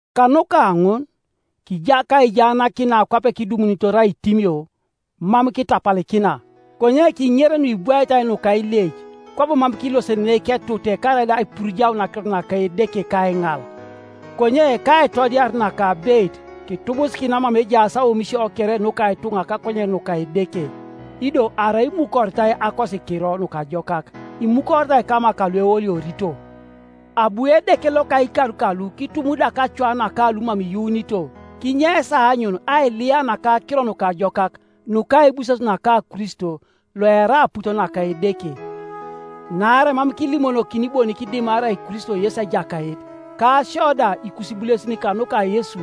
Kanuka ŋun, kija kaijaanakin na kwape kidumunitor aitimio, mam kitapalikina, konye kiŋer nuibwaitai nuka ileic; kwabo mam kilosenenei ketute karaida aipurujaun akirot naka Edeke kaiŋal, konye kaitodiar naka abeit kitubusikina mama ejaas aomisio kere nuka ituŋa kakonyen nuka Edeke. Ido arai imukoritai Akosikiro Nukajokak, imukoritai kama kalueoliorito. Abu edeke loka ikar kalu kitumudak acoa naka lumam iyuunito kinyeis aanyun ailiya naka Akiro Nukajokak nuka aibuses naka Kristo, loerai aput naka Edeke. Naarai mam kilimonokini bonik dimarai Kristo Yesu Ejakait, ka sio da ikusibulesin kanuka Yesu.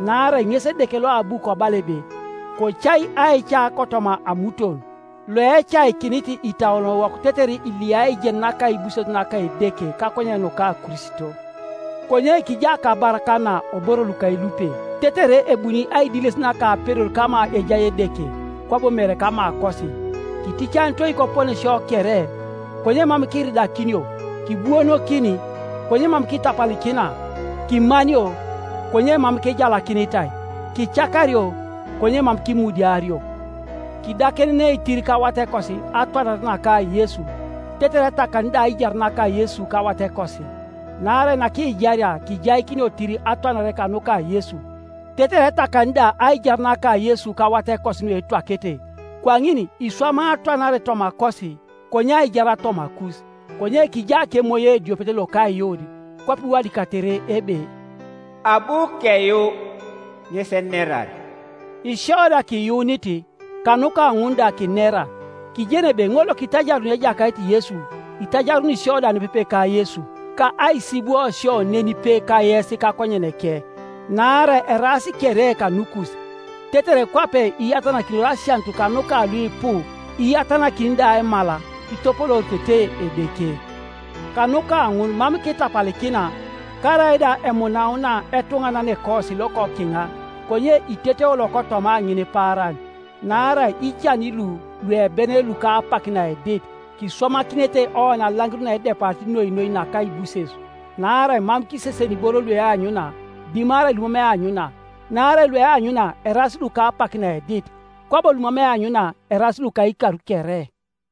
Naarai ŋes Edeke loabu kobala ebe, “Kocai aica kotoma amuton,” loecaikinit itauonowok tetere iliyai aijen naka aibuses naka Edeke kakonyen nuka Kristo. Konye kija kabar kana oboro lukelupe, tetere ebuni aidiles naka apedor kama ejai Edeke, kwabo mere kamakosi. Kiticanitoi koponesio kere, konye mam kiridakinio; kibuonokin, konye mam kitapalikina; kimanio, konye mam kijalakinitai; kicakario, konye mam kimudiario; kidakenenei tir kawatekosi atwanare naka Yesu itetere etakani da aijar naka Yesu kawatekosi. Naarai nakijaria kijaikinio tir atwanare kanuka Yesu, tetere etakani da aijar naka Yesu kawatekosi nuetwakete. Kwaŋin iswamai atwanare tomakosi, konye aijar tomakus. Konye kija kemoyo ediopet loka aiyuun, kwape iwadikatere ebe, “Abu keyuu, ŋes enerar.” Isio da kiyuunit, kanuka ŋun da kinera. Kijeni ebe ŋol lokitajaruni Ejakait Yesu, itajaruni sio da nepepe ka Yesu, ka aisibwo sio nenipe kayes kakonyeneke. Naarai eraas kere kanukus, tetere kwape iyatanakinor asianut kanuka luipu, iyatanakini da aimal, kitopolooritete Edeke. Kanuka ŋun mam kitapalikina. Karaida emunauna etuŋananekosi Iokokiŋa, konye iteteo lokotoma ŋinipaaran. Naarai ican lu luebenen luka apak naedit, kiswamakinete oni alaŋir naedepari noi noi naka aibuses, naarai mam kiseseni iboro lueanyuna, dimarai lumam eanyuna; naarai lueanyuna eraas luka apak naedit, kwabo lumam eanyuna eraas luka ikar kere.